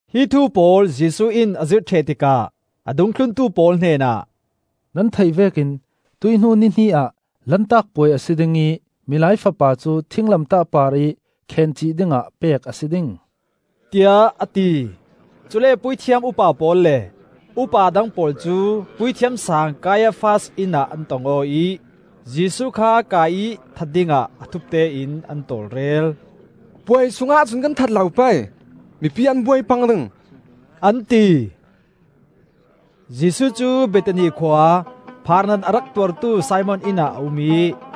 Hi thu pawl Jesuh in a zirh ṭheh tikah a dungthluntu pawl hnenah, “Nan theih vekin tuih hnu ni hnih ah Lantak Puai a si ding ih Milai Fapa cu thinglamtah parih khencih dingah pek a si ding,” tiah a ti. Cule puithiam upa pawl le upa dang pawl cu Puithiam Saang Kaiafas inn ah an tong aw ih, Jesuh kha kai ih that dingah a thupte in an tawlrel. “Puai sungah cun kan that lo pei, mipi an buai pang ding,” an ti. Jesuh cu Bethani khua, phaarnat a rak tuartu Simon inn ah a um ih,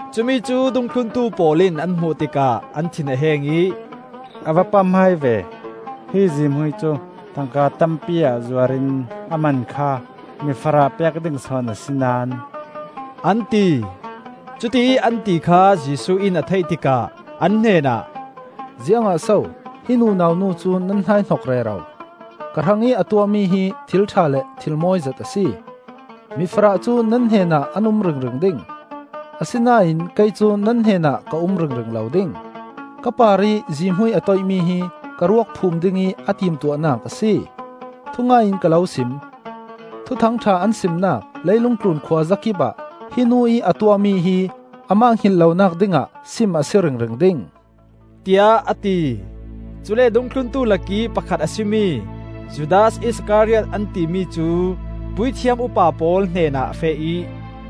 Cumi cu dungthluntu pawl in an hmuh tikah an thin a heng ih, “A va pamhmai ve! Hi zihmui cu tangka tampi ah zuar in a man kha mifarah pek ding sawn a si naón,” an ti. Cutiih an ti kha Jesuh in a theih tikah an hnenah, “Ziangah so hi nunau nu cu nan hnaihnok rero? Ka hrangih a tuahmi hi thil ṭha le thil mawi zet a si. Mifarah cu nan hnenah an um ringring ding, asinain kei cu nan hnenah ka um ringring lo ding. Ka parih zihmui a toihmi hi ka ruak phum dingih a timtuahnak a si. Thungai in ka lo sim: Thuthang ṭha an simnak leilung tlun khuazakip ah hi nu ih a tuahmi hi amah hngilh lonak dingah sim a si ringring ding,” tiah a ti. Cule dungthluntu lakih pakhat a si mi Judas Iskariot an timi cu puithiam upa pawl hnenah a feh ih,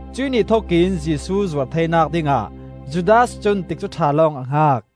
Cuih ni thokin Jesuh zuar theinak dingah Judas cun tikcu ṭha lawng a hngak.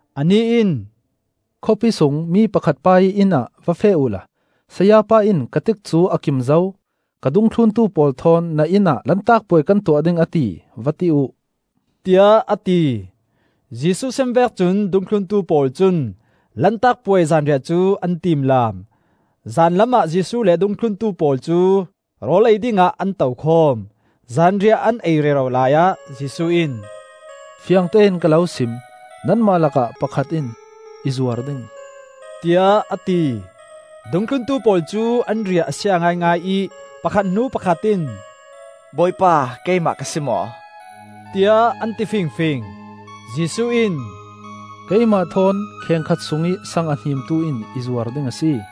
Anih in, “Khawpi sung mi pakhat pa ih inn ah va feh uhla ‘Sayapa in ka tikcu a kim zo; ka dungthluntu pawl thawn na inn ah Lantak Puai kan tuah ding, a ti,’ va ti uh,” tiah a ti. Jesuh sim vek cun dungthluntu pawl cun Lantak Puai zanriah cu an tiimlaam. Zanlam ah Jesuh le a dungthluntu pawl cu rawl ei dingah an to khawm. Zanriah an ei rero laiah Jesuh in, “Fiangtein ka lo sim: nanmah lakah pakhat in i zuar ding,” tiah a ti. Dungthluntu pawl cu an riah a sia ngaingai ih pakhat hnu pakhat in, “Bawipa, keimah ka si maw?” tiah an ti fingfing. Jesuh in, “Keimah thawn khengkhat sungih saang a hnimtu in i zuar ding a si.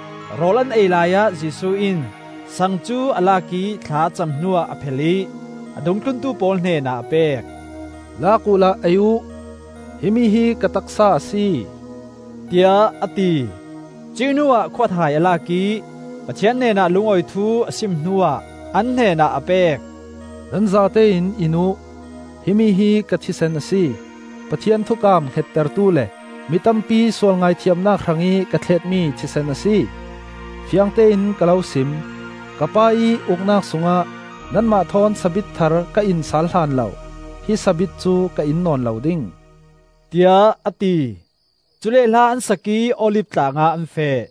Rawl an ei laiah Jesuh in saang cu a lak ih thla a cam hnuah a phel ih a dungthluntu pawl hnenah a pek. “Lak uhla ei uh; himi hi ka taksa a si,” tiah a ti. Cuih hnuah khuathai a lak ih Pathian hnenah lungawi thu a sim hnuah an hnenah a pek. “Nan zatein in uh; himi hi ka thisen a si. Pathian thukam hngettertu le mitampi sual ngaithiamnak hrangih ka thletmi thisen a si. Fiangtein ka lo sim: ka Pa ih Uknak sungah nanmah thawn sabit thar ka in sal hlan lo hi sabit cu ka in nawn lo ding,” tiah a ti. Cule hla an sak ih Olif Tlangah an feh.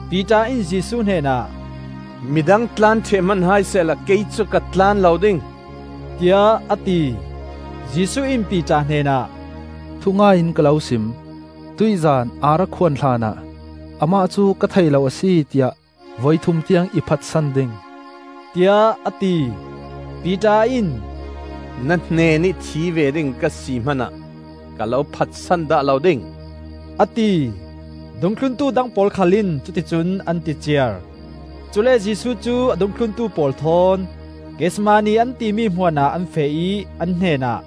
Piter in Jesuh hnenah, “Midang tlan ṭheh hman hai sehla kei cu ka tlan lo ding,” tiah a ti. Jesuh in Piter hnenah, “Thungai in ka lo sim: tuih zan ar a khuan hlanah ‘Amah cu ka thei lo a si,’ tiah voi thum tiang i phatsan ding,” tiah a ti. Piter in, “Na hnenih thi ve ding ka si hmanah ka lo phatsan dah lo ding,” a ti. Dungthluntu dang pawl khal in cuti cun an ti ciar. Cule Jesuh cu a dungthluntu pawl thawn Gethsemane an timi hmuan ah an feh ih an hnenah,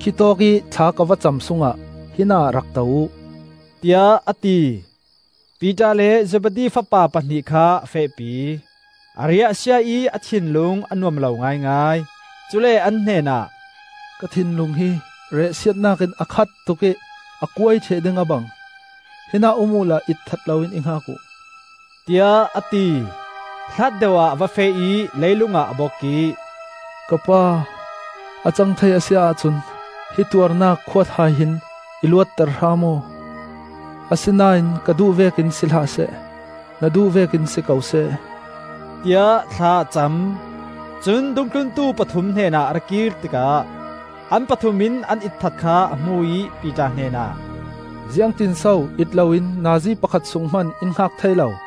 “Khitawk ih thla ka va cam sungah hinah rak to uh,” tiah a ti. Piter le Zebedi fapa pahnih kha a fehpi. A riah a sia ih a thinlung a nuam lo ngaingai. Cule an hnenah, “Ka thinlung hi riahsiatnak in a khat tuk ih a kuai ṭheh ding a bang. Hinah um uhla itthat loin i hngak uh,” tiah a ti. Hlat deuh ah a va feh ih leilung ah a bok ih, “Ka Pa, a cang thei a si ahcun hi tuarnak khuathai hin i luatter hram aw! Asinain ka duh vekin si hlah seh, na duh vekin si ko seh,” tiah thla a cam. Cun dungthluntu pathum hnenah a ra kir tikah an pathum in an itthat kha a hmu ih Piter hnenah, “Ziangtin so it loin nazi pakhat sung hman in hngak thei lo?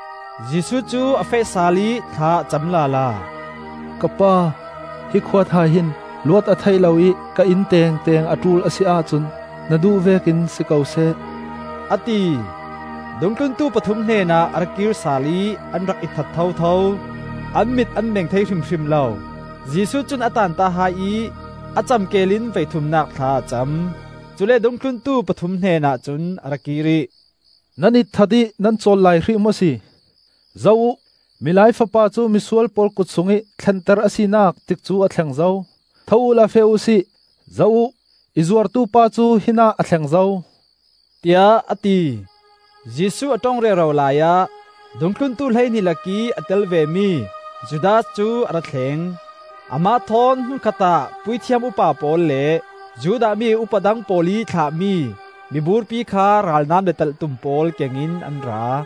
Jesuh cu a feh sal ih thla a cam lala. “Ka Pa, hi khuathai hin luat a theih lo ih ka in tengteng a ṭul a si ahcun na duh vekin si ko seh,” a ti. Dungthluntu pathum hnenah a ra kir sal ih an rak itthat thotho; an mit an meng thei hrimhrim lo. Jesuh cun a taanta hai ih a cam keel in voithumnak thla a cam. Cule dungthluntu pathum hnenah cun a ra kir ih, “Nan itthat ih nan cawl lai hrih maw si? Zoh uh! Milai Fapa cu misual pawl kut sungih thlenter a sinak tikcu a thleng zo. Tho uhla feh uhsi. Zoh uh, i zuartupa cu hinah a thleng zo,” tiah a ti. Jesuh a ṭong rero laiah dungthluntu hleihnih lakih a tel ve mi Judas cu a ra thleng. Amah thawn hmun khatah puithiam upa pawl le Judah mi upa dang pawl ih thlahmi miburpi kha ralnam le talhtum pawl keng in an ra.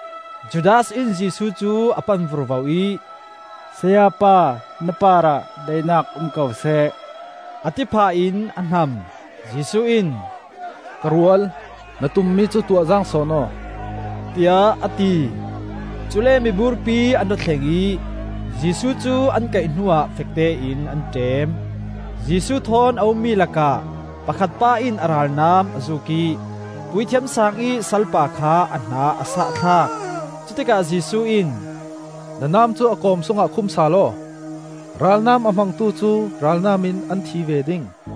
Judas in Jesuh cu a pan vurvo ih, “Sayapa, na parah daihnak um ko seh,” a ti phah in a hnam. Jesuh in, “Ka rual, na tummi cu tuah zaang sawn aw,” tiah a ti. Cule miburpi an ra thleng ih Jesuh cu an kaih hnuah fektein an ṭem. Jesuh thawn a ummi lakah pakhat pa in a ralnam a zuuk ih Puithiam Saang ih salpa kha a hna a sah thlak. Cutikah Jesuh in, “Na nam cu a kawm sungah khum sal aw. Ralnam a hmangtu cu ralnam in an thi ve ding.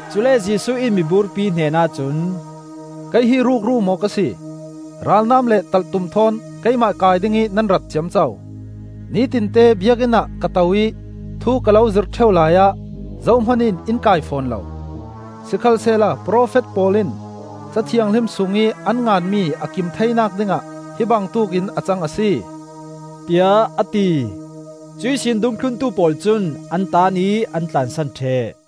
Cule Jesuh in miburpi hnenah cun, “Kei hi rukru maw ka si, ralnam le talhtum thawn keimah kai dingih nan rat ciamco? Nitinte Biakinn ah ka to ih thu ka lo zirh ṭheu laiah zohman in in kai fawn lo. Sikhalsehla profet pawl in Ca Thianghlim sungih an nganmi a kim theinak dingah hi bangtuk in a cang a si,” tiah a ti. Cuihsin dungthluntu pawl cun an taan ih an tlansan ṭheh.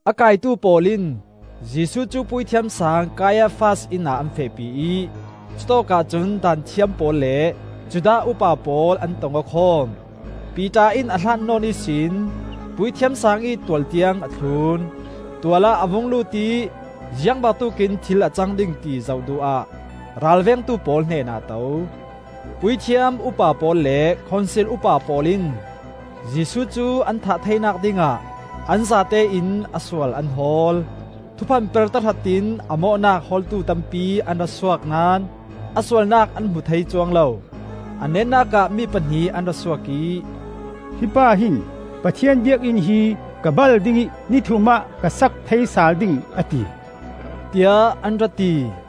A kaitu pawl in Jesuh cu Puithiam Saang Kaiafas inn ah an fehpi ih cutawkah cun Daanthiam pawl le Judah upa pawl an tong aw khawm. Piter in a hlat nawn ihsin Puithiam Saang ih tual tiang a thlun. Tual ah a vung lut ih ziang bangtuk in thil a cang ding ti zoh duh ah ralvengtu pawl hnenah a to. Puithiam upa pawl le Khonsil upa pawl in Jesuh cu an thah theinak dingah an zatein a sual an hawl. Thuphan per tahratin a mawhnak hawltu tampi an ra suak naón a sualnak an hmu thei cuang lo. A netnak ah mi pahnih an ra suak ih, “Hi pa hin ‘Pathian Biakinn hi ka bal ding ih ni thum ah ka sak thei sal ding,’ a ti,” tiah an ra ti.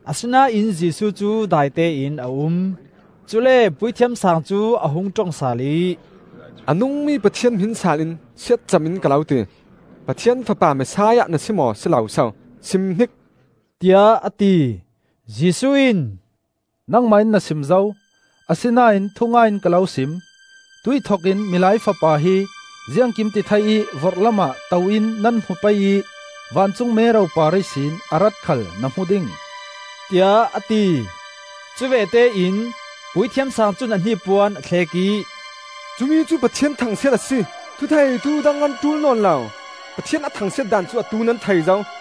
Asinain Jesuh cu daitein a um. Cule Puithiam Saang cu a hung ṭong sal ih, “A nungmi Pathian hmin saal in siatcam in ka lo ti: Pathian fapa Messiah na si maw si lo so, sim hnik,” tiah a ti. Jesuh in, “Nangmah in na sim zo! Asinain thungai in ka lo sim: tuih thokin Milai Fapa hi Ziangkimtithei ih vorhlam ah to in nan hmu pei ih vancung mero par ihsin a rat khal na hmu ding,” tiah a ti. Cuvete in Puithiam Saang cun a hnipuan a thlek ih, “Cumi cu Pathian thangsiat a si! Thutheitu dang kan ṭul nawn lo. Pathian a thangsiat daan cu atu nan thei zo!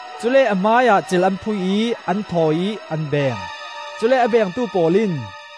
Cule a hmaiah cil an phui ih an thawi ih an beng. Cule a bengtu pawl in,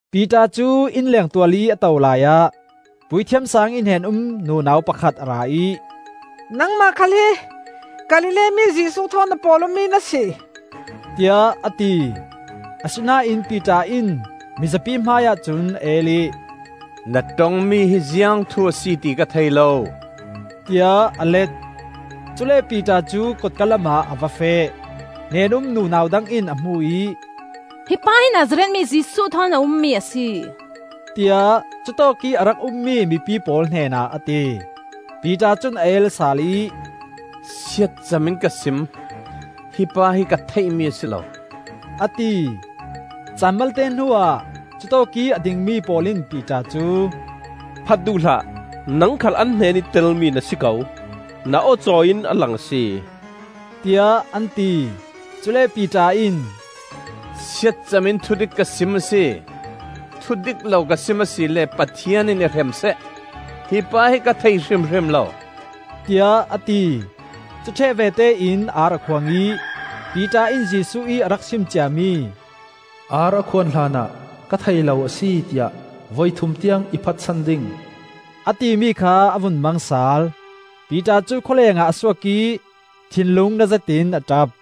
Piter cu innleng tual ih a to laiah Puithiam Saang ih hnen-um nunau pakhat a ra ih, “Nangmah khal hi Galilee mi Jesuh thawn a pawl-awmi na si,” tiah a ti. Asinain Piter in mizapi hmaiah cun a el ih, “Na ṭongmi hi ziang thu a si ti ka thei lo,” tiah a let. Cule Piter cu kotka lamah a va feh. Hnen-um nunau dang in a hmu ih, “Hi pa hi Nazareth mi Jesuh thawn a ummi a si,” tiah cu tawkih a rak ummi mipi pawl hnenah a ti. Piter cun a el sal ih, “Siatcam in ka sim: hi pa hi ka theihmi a si lo,” a ti. Caan malte hnuah cutawkih a dingmi pawl in Piter cu, “Phat duh hlah, nang khal an hnenih telmi na si ko. Na aw cawi in a lang a si,” tiah an ti. Cule Piter in, “Siatcam in thudik ka sim a si. Thudik lo ka sim a si le Pathian in i hrem seh! Hi pa hi ka thei hrimhrim lo,” tiah a ti. Cuṭheh vete in ar a khuang ih, Piter in Jesuh ih a rak sim ciami, “Ar a khuan hlanah ka thei lo a si, tiah voithum tiang i phatsan ding,” a timi kha a vun mang sal. Piter cu khawlengah a suak ih thinlung na zetin a ṭap.